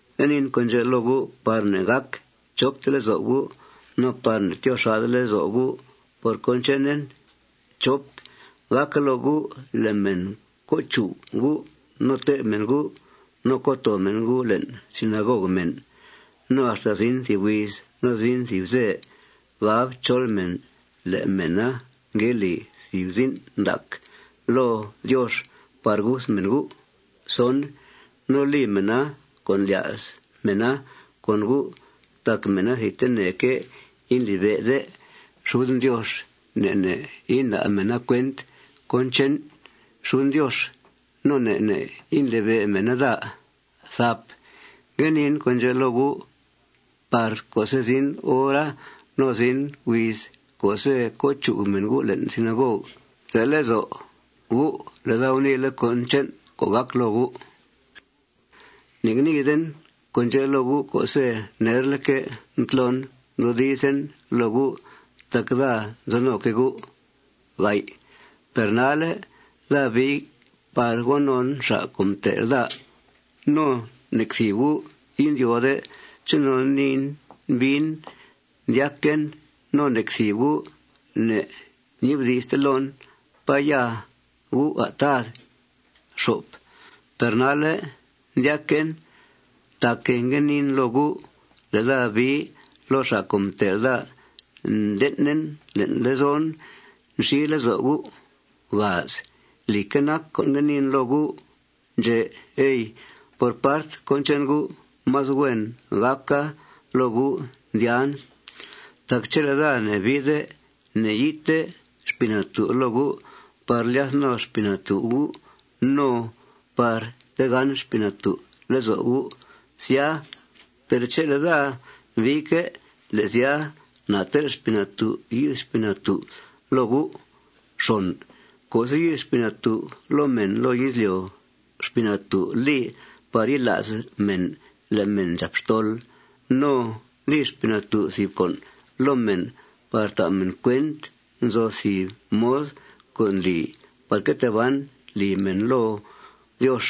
Ngue niin con' ndxè' loo gu' par ne'gàc chopte lezo' gu' no par ne'tyoo xà'de lezo' gu' por cón chenen. Gàca loo gu' le' mèn co' chug gu' no tè'b mèn gu' no co' too mèn gu' le'n sinagog mèn. No axta zin thìb huiz no zin thìb ze gab chol mèn le' mèna ngue li thìb zin' ndac loo Diox por guth mèn gu'. No li mèna con' ndlya's mèna con gu' tac mèna thidteneque' indlibe'de xuden Diox. Ne' ne' inda' mèna cuent cón che'n xuden Diox. No ne' ne' indlibe' mèna daa. Ngue niin con' ndxè' loo gu' par co'se' zin hora no zin huiz co'se' co' chug mèn gu' le'n sinagog, te' lezo' gu' le' daa guniile' cón che'n co' gàc loo gu'. Ne'ngniiden con' ndxè' loo gu' co'se' nerleque' mtlon mdoodizen loo gu' tac daa nzo noque' gu'. Per nalle' daa bii par go non xa' co' mtel' daa. No nec thìb gu' indyóode chonon niin biin, ndyaquen. No nec thìb gu' ne'nibdi'ste loon: ¿Pá ya U', à', Tad? Per nalle' ndyaquen tac guniin loo gu' le' daa bii loo xa' co' mtel' daa, nden'en le'n lezon nxi lezo' gu'. Lìcque' nac co' ngue niin loo gu' ndxè', ey. Por part cón che'n gu', más huen gàca loo gu' ndyàan. Tac chele' daa ne'biide, ne'yi'thte Xpii Natú' loo gu' par lyath no Xpii Natú' gu' no par tegán Xpii Natú' lezo' gu', sya. Per chele' daa biique', le' sya, na tel' Xpii Natú' yi'th Xpii Natú' loo gu'. Co'se' yi'th Xpii Natú' loo mèn loo izlyo', Xpii Natú' li par yila's mèn le' mèn ndxàp xtol. No li Xpii Natú' thìb con' loo mèn par ta' mèn cuent nzo thìb mod co' ndli par que tee ban lì mèn loo Diox.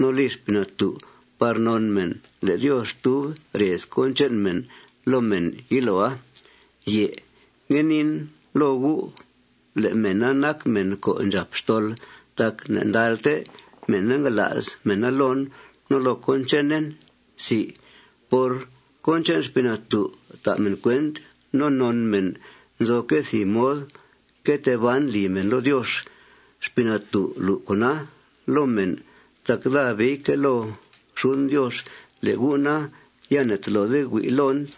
No li Xpii Natú' par non mèn le' Diox tub rez cón che'n mèn loo mèn yiloa. Na ngue nii loo gu' le' mèna nac mèn co' ndxàp xtol tac ne'ndalte mèna ngala's mèna loon no loo cón chenen. Por cón che'n Xpii Natú' ta' mèn cuent no non mèn nzoque' thìb mod que tee ban lì mèn loo Diox. Xpii Natú' lu' con'a loo mèn tac daa biique' loo xuden Diox. Le' gu' na, ya ne'tolode hui' loon.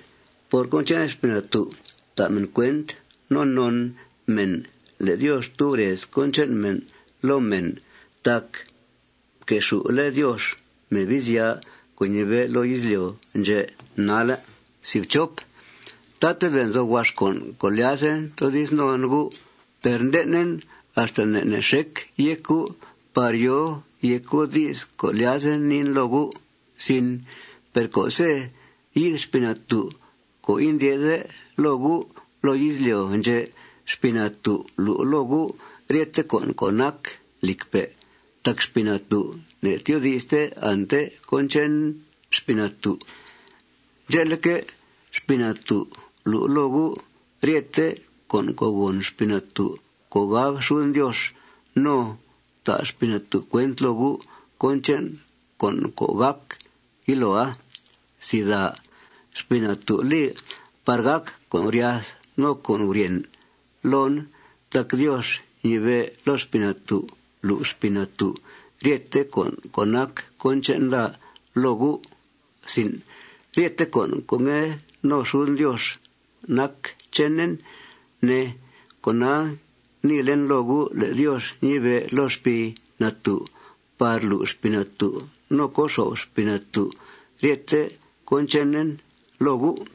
Por cón che'n Xpii Natú' ta' mèn cuent no non mèn le' Diox tub rez cón che'n mèn loo mèn tac mquexù'le' Diox Mebizya co' ñibe'pe' loo izlyo' ndxè' nalle'. Tatabe' nzo huax con' co' ndlyazen toodiz non gu'. Per nden'en axta ne' ne' xec yéc gu' par yòo yéc gu' di's co' lyazen niin loo gu'. Per co'se' yi'th Xpii Natú' co' indyè'de loo gu' loo izlyo' ndxè', Xpii Natú' lu' loo gu' ryete con' co' nac lìcpe'. Tac Xpii Natú' ne'tyoodi'ste ante cón che'n Xpii Natú'. Ndxe'leque', Xpii Natú' lu' loo gu' ryete con' co' gòn Xpii Natú' co' gab xuden Diox. No ta' Xpii Natú' cuent loo gu' cón che'n con' co' gàc yiloa. Xpii Natú' li par gàc con' guryath no con' guryèn loon tac Diox ñibe' loo Xpii Natú' lu' Xpii Natú' ryete con' co' nac cón che'n daa loo gu'. Ryete con' co' ngue no xuden Diox nac chenen, ne. Cona, guniilen loo gu' le' Diox ñibe' loo Xpii Natú' par lu' Xpii Natú' no co xo'f Xpii Natú' ryethe cón chenen loo gu'.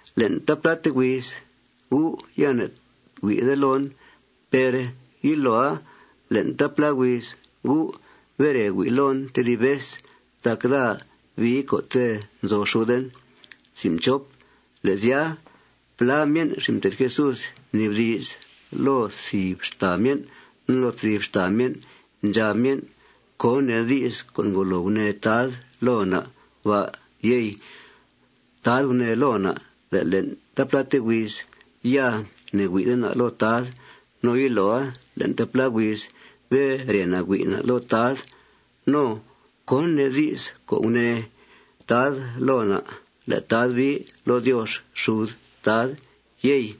Le'n taapláte huiz gu' ya ne'hui'de loon. Per yiloa le'n taaplá huiz gu' bere hui' loon tedib vez tac daa bii co'te' nzo xuden. Le' sya, plá myen' xin' mté'th Jesús mnibdi's loo thìb xtàa myen' no loo tedib xtàa myen'. Ndxab myen': ―¿Cón nee di's di's co' ngolo gunee Tad loo na' ba', yey? Tad gunee loo na' le' le'n taapláte huiz ya ne'hui'de na' loo Tad no yiloa le'n taaplá huiz bere na' hui' na' loo Tad. No ¿cón nee di's co' gunee Tad loo na' le' Tad bii loo Diox xud Tad, yey?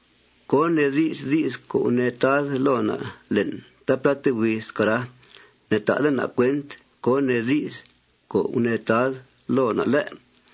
¿Cón nee di's di's co' gunee Tad loo na' le'n taapláte huiza, cara? Ne'ta'de na' cuent cón nee di's co' gunee Tad loo na', ¿lé'?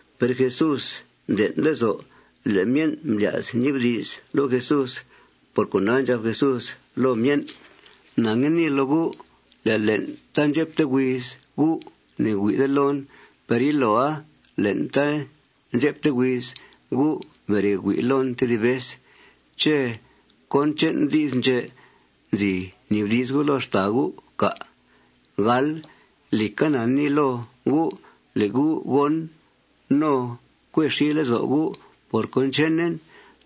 Per Jesús mden' lezo' le' myen' mblya's ñibdi's loo Jesús. Por cona, ndxab Jesús loo myen': ―Na ngue nii loo gu' le' le'n taandxepte huiz gu' ya ne'hui'de loon. Per yiloa le'n taandxepte huiz gu' bere hui' loon tedib vez. ¿Ché' cón che'n di's ndxè' nzi nibdi's gu' loo xtàa gu', cà'? Lìca, na nii loo gu' le' gu' gón' no cue xi lezo' gu' por cón chenen.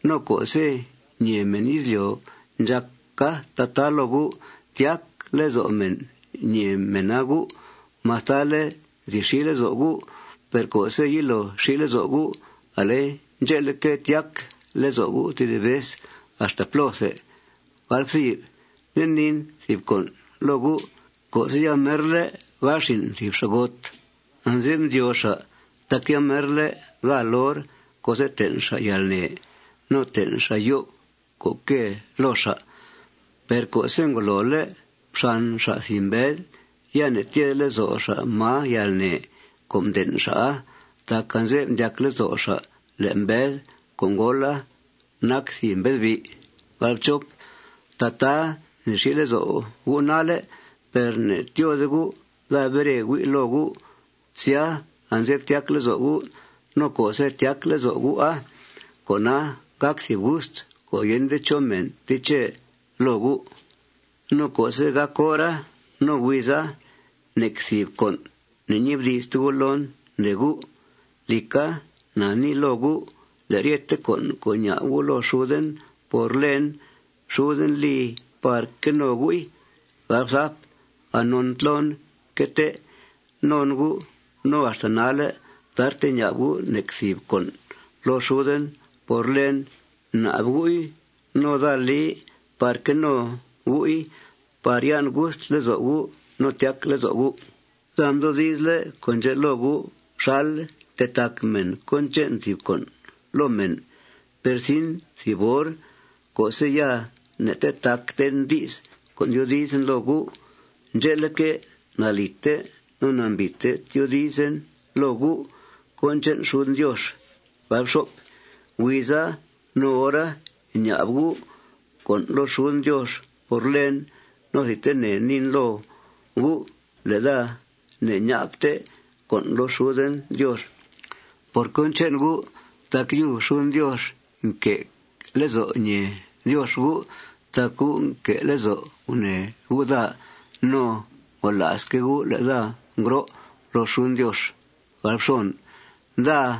No co'se' ñèe mèn izlyo' ndxàca tataa loo gu', tyac lezo' mèna ñèe mèna gu'. Mastale' nzi xi lezo' gu', per co'se' yilo xi lezo' gu', ale ndxe'leque', tyac lezo' gu' tedib vez axta plóthe. Nde niin thìb con' loo gu': Co'se' yamerle' gáal xin' thìb xa'got, anze'f ndyóo xa' tac yamerle' gáal hor co'se' ten' xa' yalnè no ten' xa' yo'f co' quée loo xa'. Per co'se' ngolole' mxan xa' thìb mbed, ya ne'tyede lezo' xa' máa yalnè co' mden' xa'a tac anze'f ndyac lezo' xa' le' mbed co' ngóola nac thìb mbedbi'. Tataa nzi xi lezo' gu' nalle'. Per ne'tyóode gu'. Daa bere hui' loo gu'. Sya, anze'f tyac lezo' gu'. No co'se' tyac lezo' gu'a, con'a gàc thìb gust co' yende chó mèn teche loo gu'. No co'se' gàc hora no huiza, nec thìb con' ne'ñibdi'ste gu' loon, ndee gu'. Lìca, na nii loo gu' le' ryete con' co' ña'b gu' loo xuden por lèen, xuden li par que no gu'i. Anon mtlon mque tee non gu' no axta nalle' tarte ña'b gu' nec thìb con' loo xuden por lèen. Bnab gu'i no daa li par que no gu'i par yan' gust lezo' gu' no tyac lezo' gu'. Daa mdoodizle' con' ndxè' loo gu' xal ntetac mèn cón che'n thìb con' loo mèn. Per zin thìb hor co'se' ya ne'tetacten di's co' tyoodizen loo gu'. Ndxe'leque', nalìte no nambìite tyoodizen loo gu' cón che'n xuden Diox. Huiza no hora ña'b gu' con' loo xuden Diox por lèen. No thidtene niin loo gu' le' daa ne'ña'bte con' loo xuden Diox por cón che'n gu' tac yub xuden Diox nque' lezo' ñèe Diox gu' tac gu' nque' lezo' gunèe gu' daa. No ngola'sque' gu' le' daa ngro' loo xuden Diox. Daa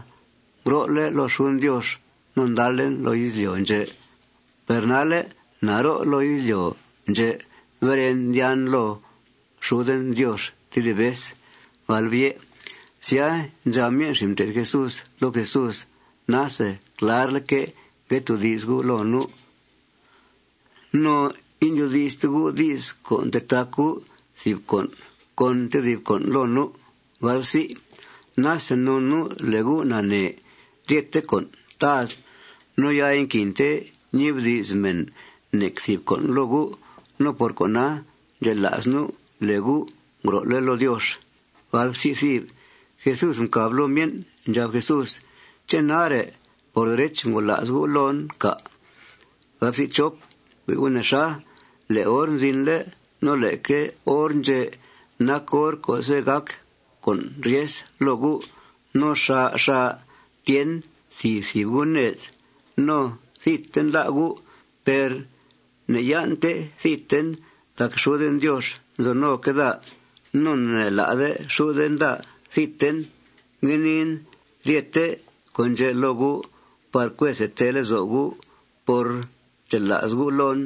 ngro'le' loo xuden Diox no ndalen loo izlyo' ndxè'. Per nalle' na ro' loo izlyo' ndxè'. Beren, ndyàan loo xuden Diox tedib vez. Sya, ndxab myen' xin' mté'th Jesús loo Jesús: ―Nase clarleque' ngue toodi's U' loo nu'. No indyoodi'ste U' di's co' ntetac U' thìb con' con tedib con' loo nu'. Nase non nu' le' U' nanee ryethe con', Tad. No ya inaquinte ñibdi's mèn nec thìb con' loo U'. No por cona, ndxela's nu' le' U' ngro'le' loo Diox. Jesús mcàb loo myen'. Ndxab Jesús: ―¿Ché' nare', por derech, ngola's gu' loon, cà'? Hui' gu' nexa. Le' hor mzinle' no leque hor ndxè' nac hor co'se' gàc con' ryes loo gu'. No xà' xà' tyen thìb thìb gu' ned. No thidten lá' gu'. Per ne'yan'te thidten tac xuden Diox nzo noque' daa. No ne'lá'de xuden daa thidten. Ngue niin ryete con' ndxè' loo gu' par cue see tee lezo' gu' por ndxela's gu' loon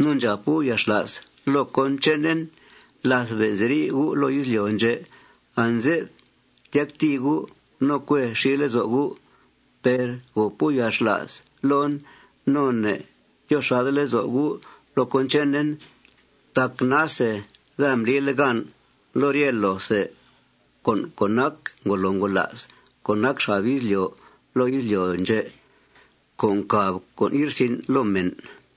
no ndxàp gu' yalxla's loo cón chenen. Láth be' nziri' gu' loo izlyo' ndxè', anze'f tyactìi gu' no cue xi lezo' gu'. Per gòp gu' yalxla's loon no ne'tyoo xà'de lezo' gu' loo cón chenen. Tac nase daa mblile' gan loo rye loothe con' co' nac ngolo ngola's co' nac xab izlyo' loo izlyo' ndxè' co' ncàb con' ye'rsin' loo mèn.